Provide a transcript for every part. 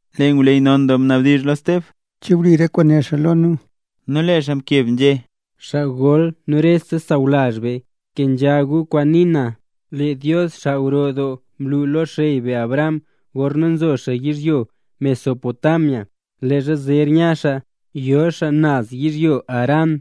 Lee ngwleyy non doo mnabdizh lo Steb: —¿Che wli re kwaan né xaa lo nu? Nu lee xaa mkeb nzhé: —Xaa gol nu rese xaa sawlazh be, kenzha gu kwaan nii na. Lee Dios, xaa gro doo, mlu lo xey be Abraham, gorna nzo xaa yizhyo Mesopotamia, leezha zer nya xaa yo xaa naz yizhyo Harán.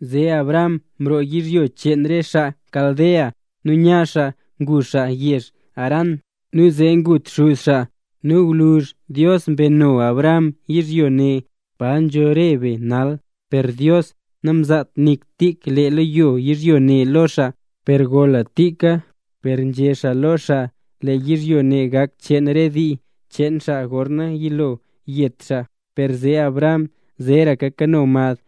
Zee Abraham mroo yizhyo cheen re xaa Caldea, nu nya xaa ngu xaa yezh Harán. Nu zee ngut xuz xaa, nu gwluzh Dios mbeno Abraham yizhyo ne, pa nzho re be nal. Per Dios namzaat nik tub lee leyo yizhyo ne lo xaa, per gola tika. Per nzhé xaa lo xaa, lee yizhyo ne gak cheen re dii cheen xaa, gorna yilo yet xaa, per zee Abraham zeeraka kano mad.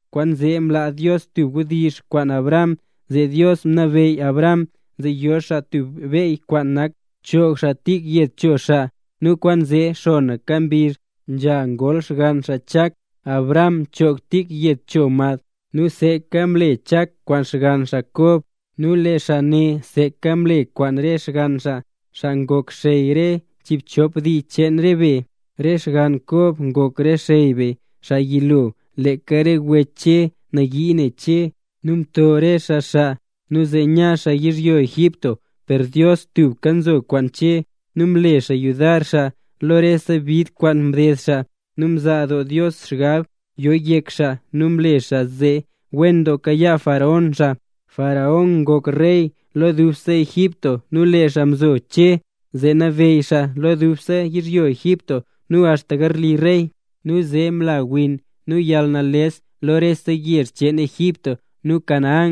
Kwaanzee mlaa Dios tub wdizh kwaan Abraham, zee Dios mnabeyy Abraham zee yo xaa tub beyy kwaan nak choog xaa tik yed cho xaa. Nu kwaanzee xonaka mbizh nzha ngol xgann xaa Chak, Abraham mchoog tik yed cho mad. Nu seeka mle Chak kwaan xgann xaa Kob, nu lee xaa ne seeka mle kwaan re xgann xaa, xaa ngok xey re chiibchop dii cheen re be. ’Re xgann Kob ngok re xey be, xaa yilo. Leeka re wech Che nayii ne Che nu mto re xaa xaa nu zee nya xaa yizhyo Egipto. Per Dios tubka mzo kwaan Che, nu mle xaa yudar xaa lo rese bid kwaan mded xaa. Nu mzaa doo Dios xgab yo yek xaa nu mle xaa zee wen doo kayaa faraón xaa. Faraón ngok rey lo dubse Egipto nu lee xaa mzo Che zee nabeyy xaa lo dubse yizhyo Egipto nu axta garli rey. ’Nu zee mla win nu yalnales lo rese yezh cheen Egipto nu Canaán,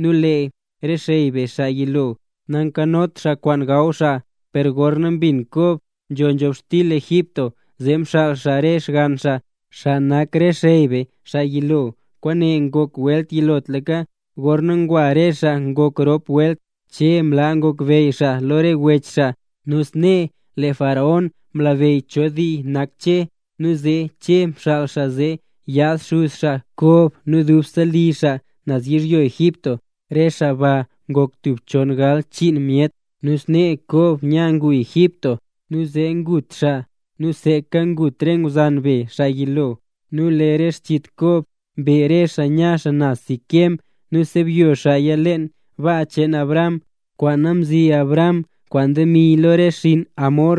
nu lee re xey be xaa yilo, nankanot xaa kwaan gaw xaa. Per gorna mbin Kob nzho nzhobxtil Egipto, zee mxaal xaa re xgann xaa, xaa nak re xey be, xaa yilo. Kwaane ngok welt yilotlaka. Gorna ngwa re xaa ngok rop welt, Che mlaa ngokbeyy xaa lo re wech xaa, nu snee lee faraón mlabeyy cho dii nak Che. Nu zee Che mxaal xaa zee yaad xuz xaa Kob nu dubse li xaa naz yizhyo Egipto. Re xaa ba ngok tub chon galbchiin myet. Nu snee Kob nya ngu Egipto, nu zee ngut xaa nu seeka ngut re ngwzan be xaa yilo. Nu lee re xchit Kob mbe re xaa nya naz Siquem nu msebyo xaaya leen baa cheen Abraham, kwaana mzi Abraham kwaan demi lo re xinn Hamor,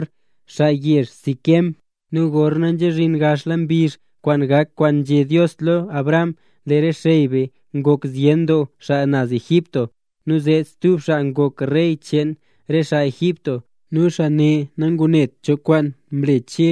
xaa yezh Siquem. ’Nu gorna nzha zhin gaxla mbizh kwaan gak kwaan nzhé Dios lo Abraham, lee re xey be ngok zyen doo xaa naz Egipto. Nu zee stub xaa ngok rey cheen re xaa Egipto, nu xaa ne nangunet cho kwaan mle Che.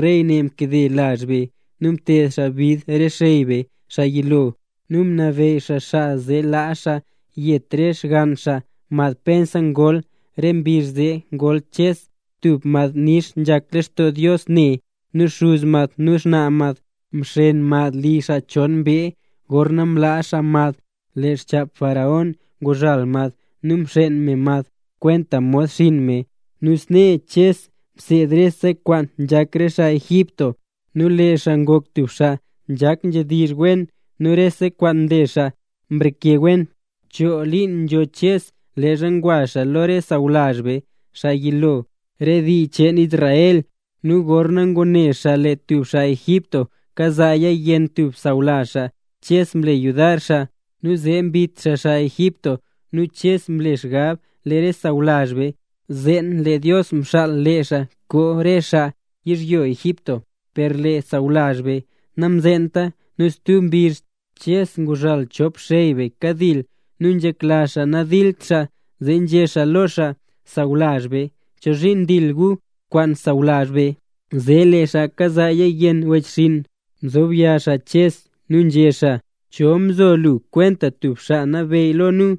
Rey ne mkade lazh be, nu mted xaa bid re xey be, xaa yilo. Nu mnabeyy xaa xaa zee laa xaa yet re xgann xaa, mad pensa ngol. Re mbizh zee ngol Ches, tub mad nix nzhak lextoo Dios ne. Nu xuz mad nu xnaa mad mxeen mad li xaa chon mbee. Gorna mlaa xaa mad, lee xchap faraón nguzhal mad nu mxeen me mad kwenta mod xinn me. Nu snee Ches mseed rese kwaan nzhak re xaa Egipto, nu lee xaa ngok tub xaa nzhak nzhedizh wen nu re kwaan nle xaa mreke wen. ’Choo liin nzho Ches leezha ngwa xaa lo re sawlazh be, xaa yilo, re dii cheen Israel. Nu gorna ngune xaa lee tub xaa Egipto kazaaya yenn tub sawlazh xaa, Ches mle yudar xaa, nu zee mbit xaa xaa Egipto. Nu Ches mle xgab lee re sawlazh be, zeen lee Dios mxaal lee xaa koo xaa re xaa yizhyo Egipto; per lee sawlazh be namzeenta. Nu stub mbizh, Ches nguzhal chop xey be kadil nu nzhekla xaa nadilt xaa, zee nzhé xaa lo xaa: “Sawlazh be; ¿chozhiin ndil gu kwaan sawlazh be?” Zee lee xaa kazaaya yenn wechxinn, mzob yaa Ches nu nzhé xaa: “¿Cho mzo lu kwenta tub xaa nabeyy lo nu?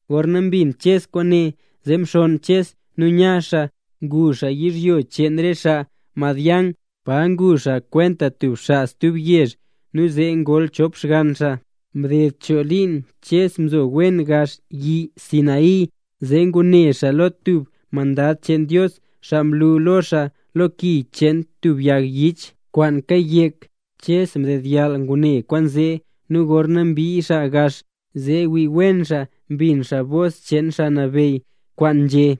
Gorna mbin Ches kwaane, zee mxonn Ches nu nya xaa ngu xaa yizhyo cheen re xaa Madián, pa ngu xaa kwenta tub xaa stub yezh nu zee ngol chop xgann xaa. ’Mded choo liin, Ches nzo wen gax yi Sinaí, zee ngune xaa lo tub mandad cheen Dios, xaa mlu lo xaa lo ki cheen tub yag yich kwaan kayek. Ches mdedyall ngune kwaanzee, nu gorna mbii xaa gax zee wii wen xaa, mbin xaa bos cheen Xaa Nabeyy, kwaan nzhé: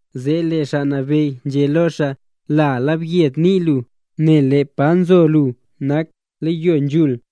Zee lee Xaa Nabeyy nzhé lo xaa: “La yelyed nii lu, nel lee pa nzo lu nak leyo nzhul.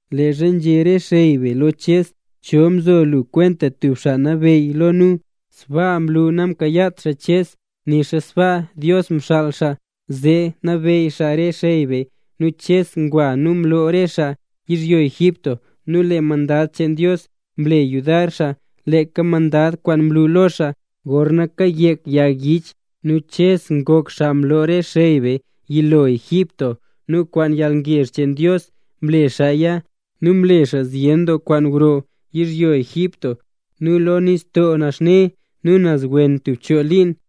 ’Leezha nzhé re xey be lo Ches: “¿Cho mzo lu kwenta tub xaa nabeyy lo nu?”, sbaa mlu namkayaat xaa Ches. Nixa sbaa Dios mxaal xaa zee nabeyy xaa re xey be nu Ches ngwa nu mloo xaa re xaa yizhyo Egipto. Nu lee mandad cheen Dios mle yudar xaa, leeka mandad kwaan mlu lo xaa gorna kayek yag yich. Nu Ches ngok xaa mloo re xey be xaa yilo Egipto, nu kwaan yalngezh cheen Dios mle xaaya nu mle xaa zyen doo kwaan gro yizhyo Egipto nu lo Nistoo Naxne nu naz wen tub choo liin.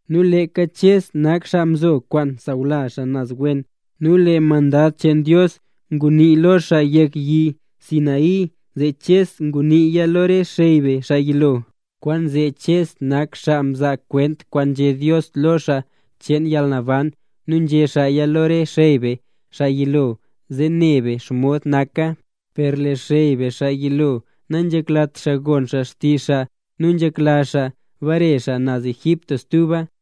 Nu leeka Ches nak xaa mzo kwaan sawlazh xaa naz wen. Nu lee mandad cheen Dios ngunii lo xaa yek yi Sinaí, zee Ches nguniiya lo re xey be xaa yilo. Kwaanzee Ches nak xaa mzaa kwent kwaan nzhé Dios lo xaa cheen yalnaban nu nzhé xaaya lo re xey be xaa yilo, zee ne be xomod naka. ’Per lee xey be xaa yilo, nanzheklat xaa gon xaa xtizh xaa, nu nzhekla xaa ngbare xaa naz Egipto stuba.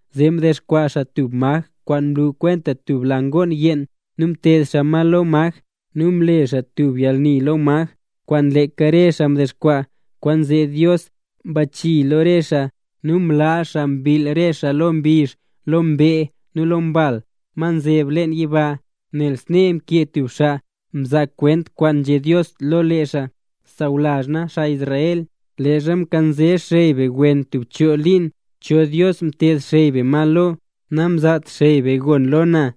Zee mdexkwaa xaa tub maj kwaan nlu kwenta tub la ngoon yeen, nu mteed xaa ma lo maj ne, nu mle xaa tub yalni lo maj kwaan leeka re xaa mdexkwaa. Kwaanzee Dios mbachii lo re xaa nu mlaa xaa mbill re xaa lo mbizh, lo mbee nu lo re mbal ma nzeb leen yiba. Nel snee mkee tub xaa mzaa kwent kwaan nzhé Dios lo lee xaa: Sawlazh na, xaa Israel. Leezha mkanze xey be wen tub choo liin, ¿cho dios mteed xey be ma lo? Namzaat xey be gon lo na.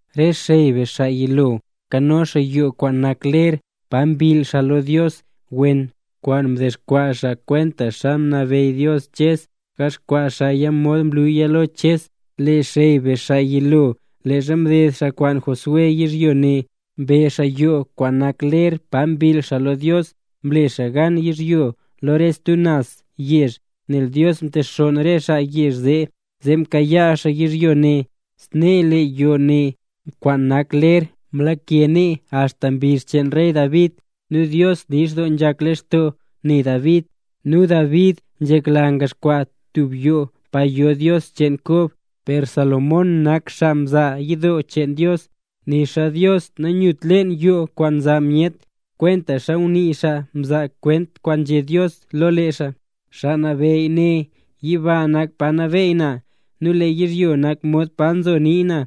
’Re xey be xaa yilo, nkano xaa yoo kwaan nak ler pa mbill xaa lo Dios naz wen, kwaan mdexkwaa xaa kwentaxa mnabeyy Dios Ches, gaxkwaa xaaya mod mluya lo Ches. Re xey be xaa yilo, leezha mded xaa kwaan Josué yizhyo ne mbe xaa yoo kwaan nak ler pa mbill xaa lo Dios. Mle xaa gan yizhyo lo re stub naz yezh, nel Dios mtexonn re xaa yezh zee, zee mkayaa xaa yizhyo ne. Snee lee yoo ne kwaan nak ler, mlake nee axta mbizh cheen rey David. Nu Dios nix doo nzhak lextoo ne David, nu David nzhekla ngaxkwaa xaa tub yidoo pa yo Dios cheen Kob. Per Salomón nak xaa mza yidoo cheen Dios, nixa Dios nanyut leen yoo kwaan nza myet, kwentaxa ngunii xaa mzaa kwent kwaan nzhé Dios lo lee xaa: Xaa Nabeyy né: “Yiba nak pa nabeey na, nu lee yizhyo nak mod pa nzo nii na.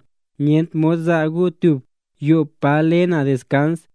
Nyent mod za gu tub yoo pa le na deskans,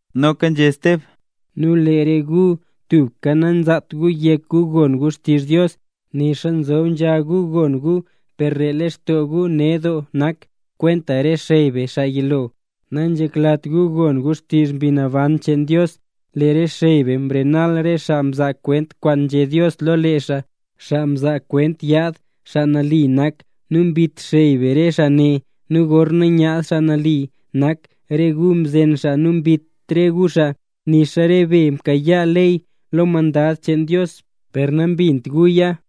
Noka nzhé Steb: —Nu lee re gu tubka nanzaat gu yek gu gon gu xtizh Dios, nixa nzob nzha gu gon gu per lee lextoo gu ned doo nak. Kwenta re xey be xaa yilo, nanzheklat gu gon gu xtizh Mbi Naban cheen Dios. Lee re xey be mrenal re xaa mzaa kwent kwaan nzhé Dios lo lee xaa, xaa mzaa kwent yaad Xaa Nali nak. Nu mbit xey be re xaa ne. Nu gorna myaad Xaa Nali nak, re gu mzen xaa nu mbit re gu xaa. Nixa re be mkayaa ley lo mandad cheen Dios, per nambint guya.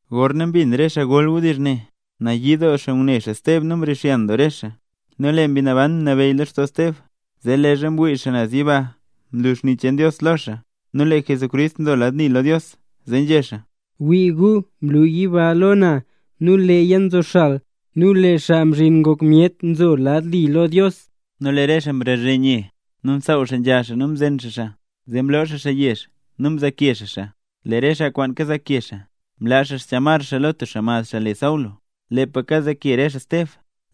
Gorna mbin re xaa gol wdizh ne, nayii doo xaa ngune xaa Steb nu mrixyan doo re xaa. Nu lee Mbi Naban mnabeyy lextoo Steb, zee leezha mwii xaa naz yiba mlu xni cheen Dios lo xaa nu lee Jesús nzo lad li lo Dios. Zee nzhé xaa: —¡Wii gu! Mlu yiba lo na nu leeya nzoxal, nu lee Xaa Mzhin Ngok Myet nzo lad li lo Dios. Nu lee re xaa mbazhe nye, nu msaaw xaa nzha xaa nu mzen xaa xaa. Zee mloo xaa xaa yezh nu mzaake xaa xaa. Lee re xaa kwaan kazaake xaa, mlaa xchamar xaa lo tub xaa mad le Saulo. Lepa kazaake re xaa Steb,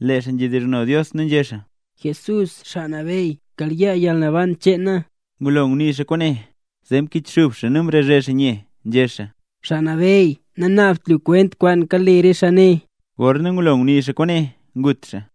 lee xaa nzhedizhno Dios nu nzhé xaa: —Jesús Xaa Nabeyy, kayaa yalnaban cheen na. Ngulo ngunii xaa kwaane, zee mkichxub xaa nu mrazhe xaa nye, nzhé xaa: —Xaa Nabeyy, nanaabt lu kwent kwaan kale re xaa ne. Gorna ngulo ngunii xaa kwaane, ngut xaa.